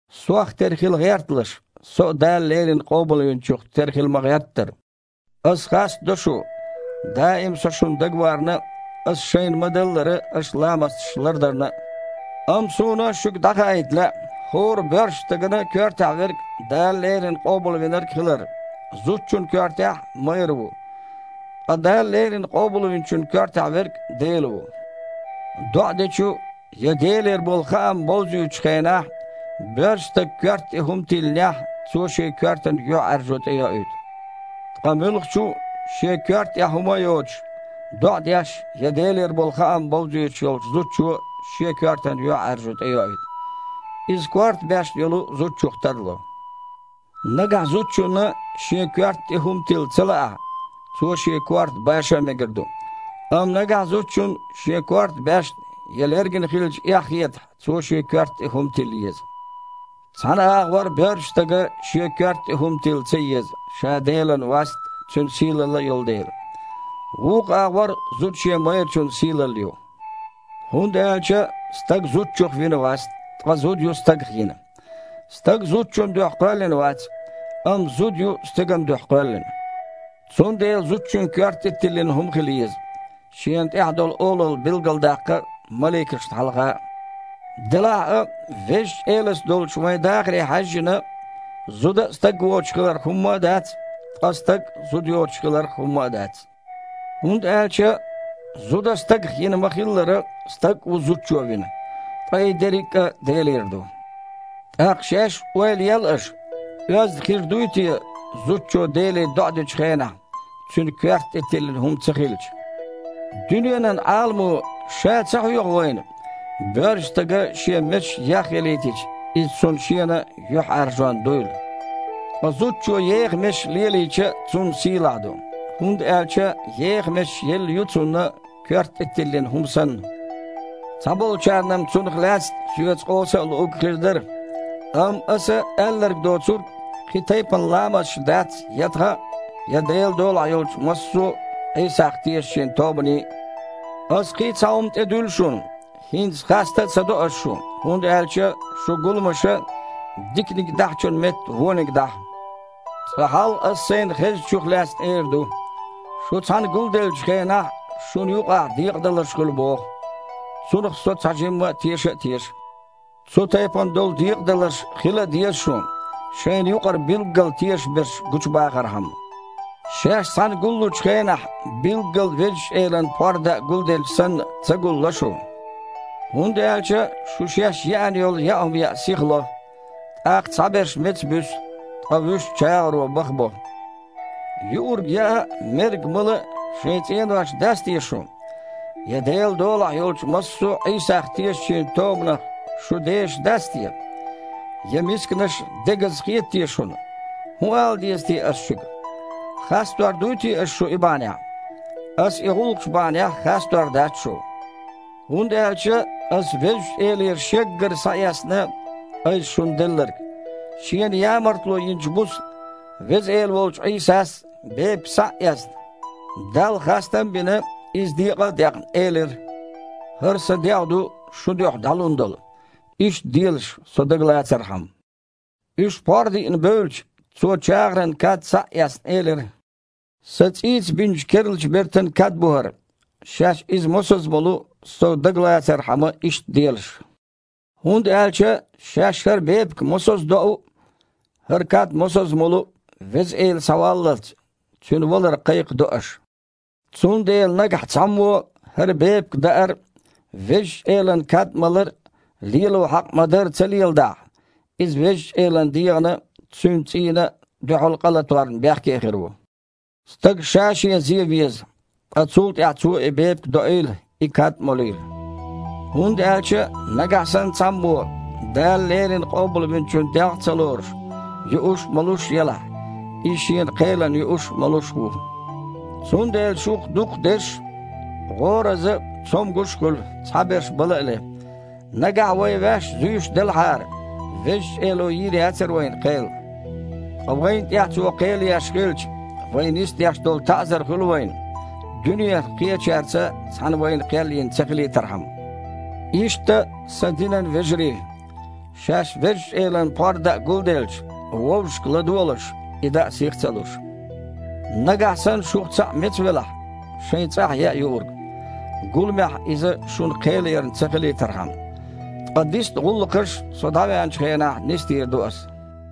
Сох тера хила гІерталаш, со а Дала леррина Къобалвинчух тера хила ма-гІерттара. Аса хастадо шу, даим а со шуна дагаварна а, аса шайна ма-даллара, аша ламасташ лардарна а. Амма суна шуьга дІахаийта лаьа, хІора боьршачу стагана коьртехь верг Дала леррина Къобалвинарг хилар. Зудчунна коьртехь – майра ву. Ткъа Дала леррина Къобалвинчун коьртехь верг Дела ву. ДоІа дечу я Делера болу хаам бовзуьйтучу хенахь боьршачу стага коьрта тІе хІума тиллинехь, цо шен коьртана юьхьІаьржо тІейоуьйту. Ткъа муьлххачу а, шен коьрта тІехь хІума а йоцуш, доІа деш я Делера болу хаам бовзуьйтуш йолчу зудчо шен коьртана юьхьІаьржо тІейоуьйту. Иза корта баьшна йолчу зудчух тарло. Нагахь зудчунна шен коьрта тІе хІума тилла ца лаахь, цо шен корта баша а мегар ду. Амма нагахь зудчунна шен корта баьшна я лергина хилча эхь хетахь, цо шен коьрта тІе хІума тилла еза. Цхьана агІор боьршачу стага шен коьрта тІе хІума тилла ца еза, ша Делан васт а, Цуьнан сийлалла а йолу дела. Вукху агІор зуда шен майрачун сийлалла ю. ХІунда аьлча стаг зудчух вина вац, ткъа зуда ю стагах йина. Стаг зудчун дуьхьа кхоьллина вац, амма зуда ю стеган дуьхьа кхоьллина. Цундела зудчун коьрта тІе тиллина хІума хила еза, шена тІехь долу олалла билгалдаккха а, маликашна хьалха а. Делахь а, Везачу Элаца долчу вайн дахаре хьаьжжина, зуда а стаг воцуш хиларх хІумма а дац, ткъа стаг а зуда йоцуш хиларх хІумма а дац. ХІунда аьлча зуда стагах йина ма-хиллара, стаг а ву зудчо вина. Ткъа и дерриг а – Делера ду. ТІаккха шаьш а ойла ел аша: оьзда хир дуй те, зудчо Деле доІа дечу хенахь, цуьнан коьрта тІе тиллина хІума ца хилча? Дуьненан Іаламо ша а ца хьоьху вайна, боьршачу стага шен месаш яхъялийтича, иза цунна шена юьхьІаьржонна дуйла? Ткъа зудчо еха месаш лелийча – цунна сийлахь ду, хІунда аьлча еха месаш елла ю цунна, коьрта тІе тиллина хІума санна. Цхьаболчарна-м цунах лаьцна соьца къовса а луург хир дара, амма, аса аьлларг доцург, кхин тайпана ламасташ дац я тхан а, я Делан долахь йолчу массо а Іийсах тешначийн тобанийн а. Аса кхин а цхьа хІума тІедуьллу шуна. ХІинца хаста а ца до ас шу, хІунда аьлча шун гуламаша, диканиг дахьачун метта, вониг дахьа. Цкъа хьалха аса сайна хезначух лаьцна эр ду. Шу цхьаьна гулделлачу хенахь шуна юкъахь декъадаларш хуьлу боху. Цунах со цхьажимма теша а теша. (Цу тайпана долу декъадаларш хила а деза шун, шайна юкъара билггал тешаш берш гучубахархьама.) Шаьш цхьаьна гуллучу хенахь, билггал Везачу Элан пхьор даа гулделча санна ца гулло шу. ХІунда аьлча шу шаьш еана йолу яа хІума яа сихло. ТІаккха цхьаберш меца буьсу, ткъа вуьш чагІаро бахабо. Юург яа а, мерг мала а шайн цІенош дац те шун? Я Делан долахь йолчу массо а Іийсах тешначийн тобанах шу дешаш дац те? Я мисканаш дегаза хета те шуна? ХІун ала деза те аса шуьга? Хастор дуй те ас шу и бахьанехь? Аса и гІуллакхаш бахьанехь хастор дац шу. ХІунда аьлча аса Везачу Элера Шеггара схьаэцна айса шуна делларг. Шена ямартло йинчу буса Веза Эла волчу Іийсас, бепиг схьа а эцна, Далла хастам а бина, иза декъа а декъна, элира: «ХІара Сан дегІ ду, шун дуьхьа дІалун долу. Иштта делаш, Со дагалацархьама». Уьш пхьор диъна бевлча, Цо, чагІаран кад схьа а эцна, элира: «Сан цІийца бинчу керлачу бертан кад бу хІара. Шаьш иза мосазза молу, Со дагалацархьама, иштта делаш». ХІунда аьлча шаьш хІара бепиг мосазза доу а, хІара кад мосазза молу а, Веза Эла схьаваллалц, Цуьнан валар кхайкхадо аша. Цундела нагахь цхьаммо хІара бепиг даар а, Везачу Элан кад малар а лело хьакъ ма-дарра ца леладахь, иза Везачу Элан дегІана а, Цуьнан цІийна а дуьхьал къа латорна бехке хир ву. Стага ша-шен зен веза, ткъа цул тІаьхьа цо и бепиг а доийла, и кад а молийла. ХІунда аьлча нагахь санна цхьаммо, Дала леррина Къобалвинчун дегІ а ца лоруш, юуш а, молуш а елахь, иза шена кхелана юуш а, молуш а ву. Цундела шух дукхахдерш гІораза а, цомгуш а хуьлу, цхьаберш бала а ле. Нагахь вай ваьш зуьйш делахьара, Везачу Эло йийр яцара вайна кхел. Ткъа вайна тІехь Цо кхел еш хилча, вай нисдеш долу таІзар хуьлу вайна, дуьненах кхечаьрца цхьаьна вайна кхел йина ца хилийтархьама. Иштта, сан динан вежарий, шаьш Везачу Элан пхьор даа гулделча, вовшашка ладогІалаш, и даа сих а ца луш. Нагахь санна шух цхьаъ меца велахь, шайн цІахь яа юург, гуламехь иза шуна кхелъярна ца хилийтархьама. Ткъа дисна гІуллакхаш со дІавеанчу хенахь нисдийр ду аса.